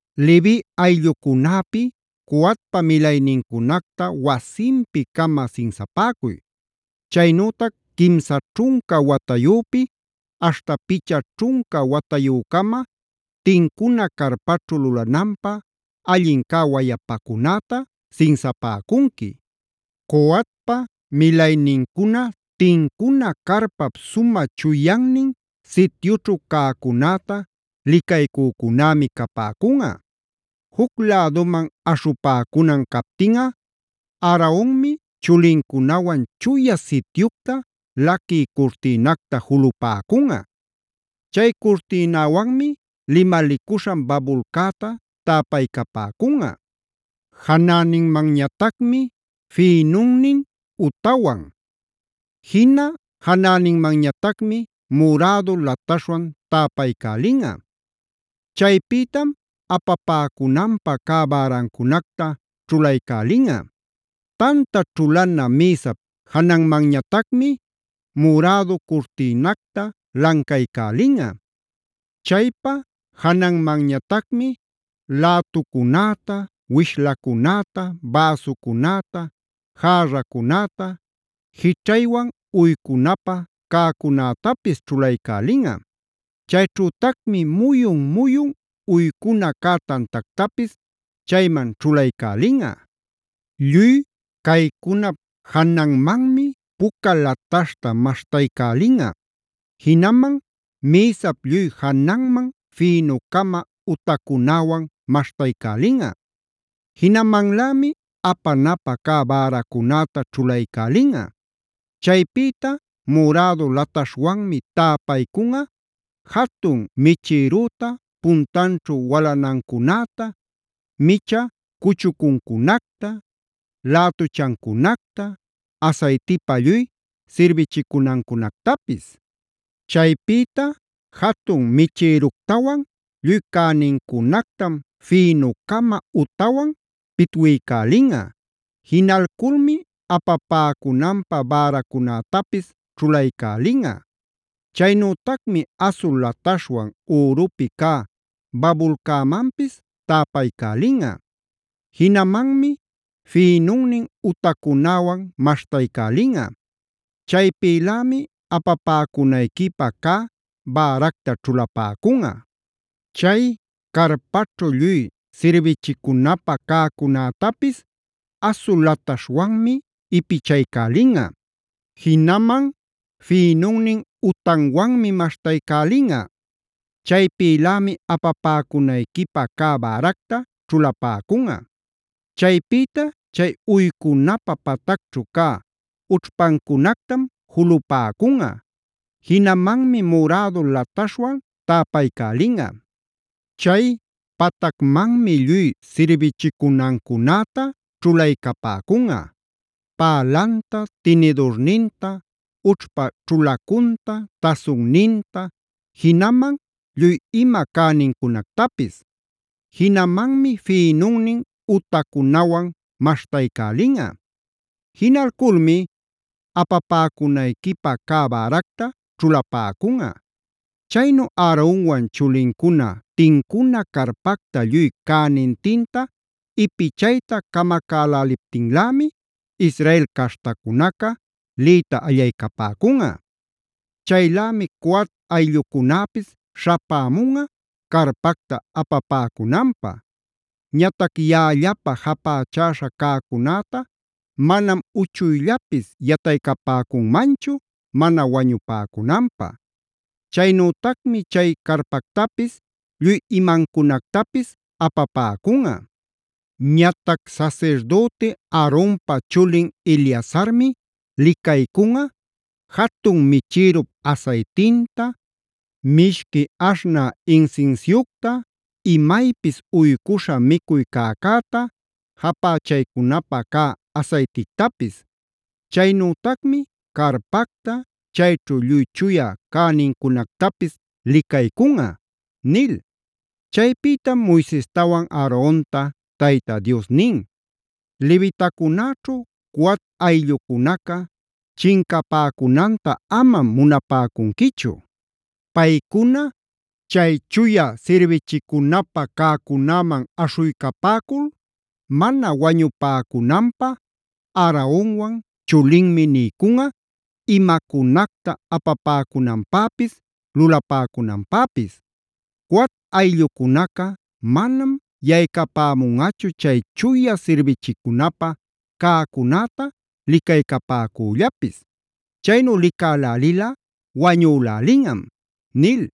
“Levi ayllucunäpi Coatpa milaynincunacta wasinpi-cama sinsapäcuy. Chaynütac quimsa ćhunca watayüpi aśhta picha ćhunca watayü-cama tincuna carpaćhu lulananpä allin cä wayapacunäta sinsapäcunqui. “Coatpa milaynincuna tincuna carpap sumä chuyannin sityućhu cäcunäta licaycücunämi capäcunꞌa. Juc läduman aśhupäcunan captinꞌa Aaronmi chulincunawan Chuya Sityucta laquï curtïnacta julupäcunꞌa. Chay curtïnäwanmi limalicuśhan babulcäta täpaycapäcunꞌa. Janäninmanñatacmi fïnunnin utawan. Jina janäninmanñatacmi murädu lataśhwan täpaycälinꞌa. Chaypïtam apapäcunanpä cä bärancunacta ćhulaycälinꞌa. “Tanta ćhulana mïsap jananmanñatacmi murädu curtïnacta lancaycälinꞌa. Chaypa jananmanñatacmi lätucunäta, wishlacunäta, bäsucunäta, järracunäta jićhaywan uycunapä ćhulaycälinꞌa. Chayćhütacmi muyun-muyun uycuna cä tantactapis chayman ćhulaycälinꞌa. Lluy caycunap jananmanmi puca lataśhta maśhtaycälinꞌa. Jinaman mïsap lluy jananman fïnu-cama utacunäwan maśhtaycälinꞌa. Jinamanlämi apanapä cä bäracunäta ćhulaycälinꞌa. Chaypïta murädu lataśhwanmi täpaycunꞌa jatun michïrüta, puntanćhu walanancunäta, micha cuchucuncunacta, lätuchancunacta, asaytipa lluy sirbichicunancunactapis. Chaypïta jatun michïructawan lluy cänincunactam fïnu-cama utawan pitwiycälinꞌa. Jinalculmi apapäcunanpä bäracunätapis ćhulaycälinꞌa. “Chaynütacmi asul lataśhwan ürupi cä babulcämanpis täpaycälinꞌa. Jinamanmi fïnunnin utacunäwan maśhtaycälinꞌa. Chaypïlämi apapäcunayquipä cä bäracta ćhulapäcunꞌa. “Chay carpaćhu lluy sirbichicunapä cäcunätapis asul lataśhwanmi ipichaycälinꞌa. Jinaman fïnunnin utanwanmi maśhtaycälinꞌa. Chaypïlämi apapäcunayquipä cä bäracta ćhulapäcunꞌa. “Chaypïta chay uycunapä patacćhu cä ućhpancunactam julupäcunꞌa. Jinamanmi murädu lataśhwan täpaycälinꞌa. Chay patacmanmi lluy sirbichicunancunäta ćhulaycapäcunꞌa: pälanta, tinidurninta, ućhpa ćhulacunta, tasunninta, jinaman lluy ima cänincunactapis. Jinamanmi fïnunnin utacunawan maśhtaycälinꞌa. Jinalculmi apapäcunayquipä cä bäracta ćhulapäcunꞌa. “Chaynu Aaronwan chulincuna tincuna carpacta lluy cänintinta ipichayta camacäläliptinlämi Israel caśhtacunaca liyta allaycapäcunꞌa. Chaylämi Coat ayllucunäpis śhapämunꞌa carpacta apapäcunanpä. Ñatac yaꞌallapä japächäśhä cäcunäta manam uchuyllapis yataycapäcunmanchu mana wañupäcunanpä. Chaynütacmi chay carpactapis lluy imancunactapis apapäcunꞌa. “Ñatac sasirdüti Aaronpa chulin Eleazarmi licaycunꞌa: jatun michirup asaytinta, mishqui aśhnä insinsiucta, imaypis uycuśhä micuy cäcäta, japächaycunapä cä asaytictapis. Chaynütacmi carpacta, chayćhu lluy chuya cänincunactapis licaycunꞌa” nil. Chaypïtam Moisestawan Aaronta Tayta Dios nin: “Levitacunäćhu Coat ayllucunaca chincapäcunanta amam munapäcunquichu. Paycuna chay chuya sirbichicunapä cäcunäman aśhuycapäcul mana wañupäcunanpä Aaronwan chulinmi niycunꞌa: imacunacta apapäcunanpäpis, lulapäcunanpäpis. Coat ayllucunaca manam yaycapämunꞌachu chay chuya sirbichicunapä cäcunäta licaycapäcüllapis. Chaynu licälälilꞌa wañülälinꞌam” nil.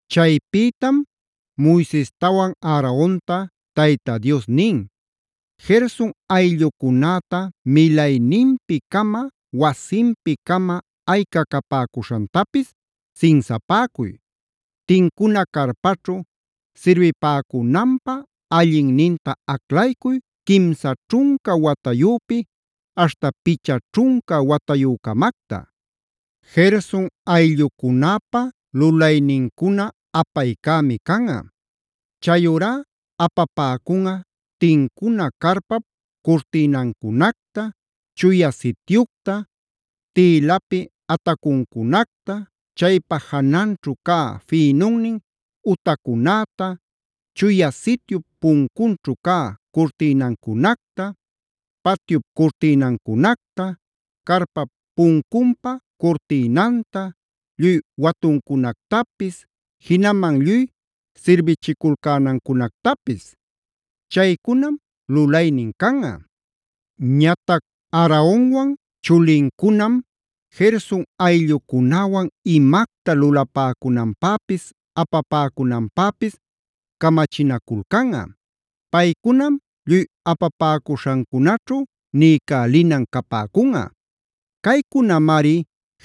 Chaypïtam Moisestawan Aaronta Tayta Dios nin: “Gerson ayllucunäta milayninpi-cama, wasinpi-cama ayca capäcuśhantapis sinsapäcuy. Tincuna carpaćhu sirbipäcunanpä allinninta aclaycuy quimsa ćhunca watayüpïta aśhta picha ćhunca watayü-camacta. “Gerson ayllucunäpä lulaynincuna apaycämi canꞌa. Chayurá apapäcunꞌa: tincuna carpap curtïnancunacta, Chuya Sityucta, tïlapi atacucunacta, chaypa jananćhu cä fïnunnin utacunäta, Chuya Sityup puncunćhu cä curtïnancunacta, patyup curtïnancunacta, carpap puncunpa curtïnanta, lluy watuncunactapis, jinaman lluy sirbichiculcänancunactapis. Chaycunam lulaynin canꞌa. Ñatac Aaronwan chulincunam Gerson ayllucunäwan imacta lulapäcunanpäpis apapäcunanpäpis camachinaculcäla. Paycunam lluy apapäcuśhancunaćhu niycälinan capäcula. Caycunamari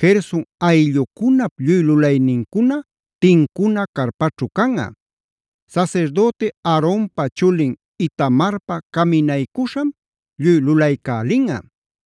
Gerson ayllucunap lluy lulaynincuna tincuna carpaćhu canꞌa. Sasirdüti Aaronpa chulin Itamarpa caminaycuśham lluy lulaycälinꞌa.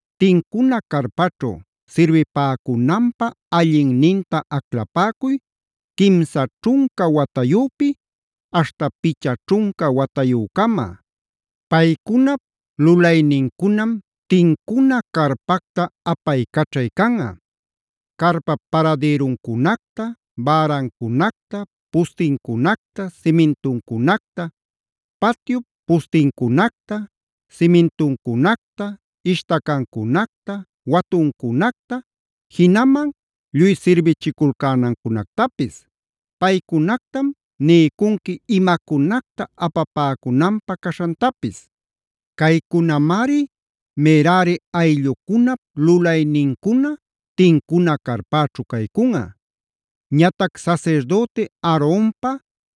Tincuna carpaćhu sirbipäcunanpä allinninta aclapäcuy quimsa ćhunca watayüpïta aśhta picha ćhunca watayü-cama. Paycunap lulaynincunam tincuna carpacta apaycaćhay canꞌa: carpap paradïruncunacta, bärancunactapis, pustincunacta, simintuncunacta, patyup pustincunacta, simintuncunacta, ishtacancunacta, watuncunacta, jinaman lluy sirbichiculcänancunactapis. Paycunactam niycunqui imacunacta apapäcunanpä caśhantapis. Caycunamari Merari ayllucunap lulaynincuna tincuna carpaćhu caycunꞌa. Ñatac sasirdüti Aaronpa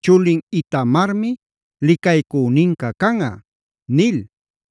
chulin Itamarmi licaycüninca canꞌa” nil.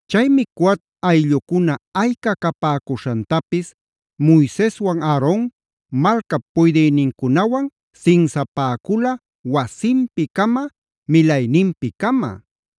Chaymi Coat ayllucuna ayca capäcuśhantapis Moiseswan Aaron malcap puydïnincunawan sinsapäcula wasinpi-cama, milayninpi-cama.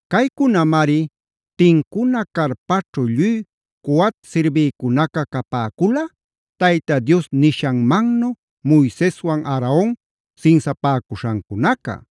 Caycunamari tincuna carpaćhu lluy Coat sirbïcunaca capäcula Tayta Dios nishanmannu Moiseswan Aaron sinsapäcuśhancunaca.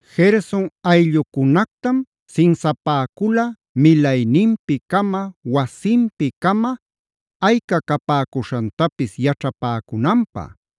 Gerson ayllucunactam sinsapäcula milayninpi-cama, wasinpi-cama ayca capäcuśhantapis yaćhapäcunanpä.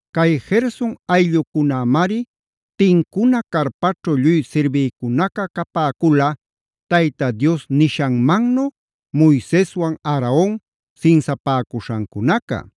Cay Gerson ayllucunämari tincuna carpaćhu lluy sirbïcunaca capäcula Tayta Dios nishanmannu Moiseswan Aaron sinsapäcuśhancunaca.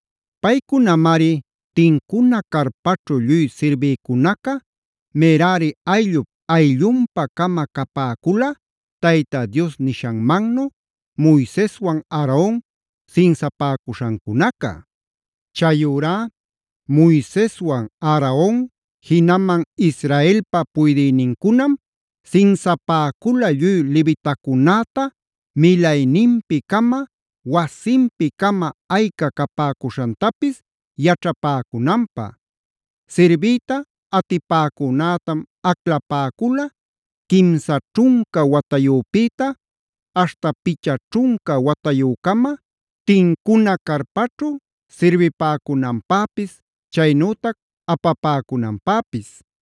Paycunamari tincuna carpaćhu lluy sirbïcunaca Merari ayllup ayllunpa-cama capäcula Tayta Dios nishanmannu Moiseswan Aaron sinsapäcuśhancunaca. Chayurá Moiseswan Aaron jinaman Israelpa puydïnincunam sinsapäcula lluy levitacunäta milayninpi-cama, wasinpi-cama ayca capäcuśhantapis yaćhapäcunanpä. Sirbiyta atipäcunätam aclapäcula quimsa ćhunca watayüpïta aśhta picha ćhunca watayü-cama tincuna carpaćhu sirbipäcunanpäpis, chaynütac apapäcunanpäpis.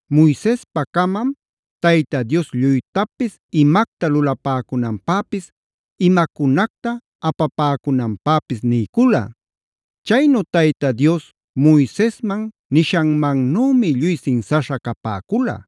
Moisespacamam Tayta Dios lluytapis imacta lulapäcunanpäpis, imacunacta apapäcunanpäpis niycula. Chaynu Tayta Dios Moisesman nishanmannümi lluy sinsaśha capäcula.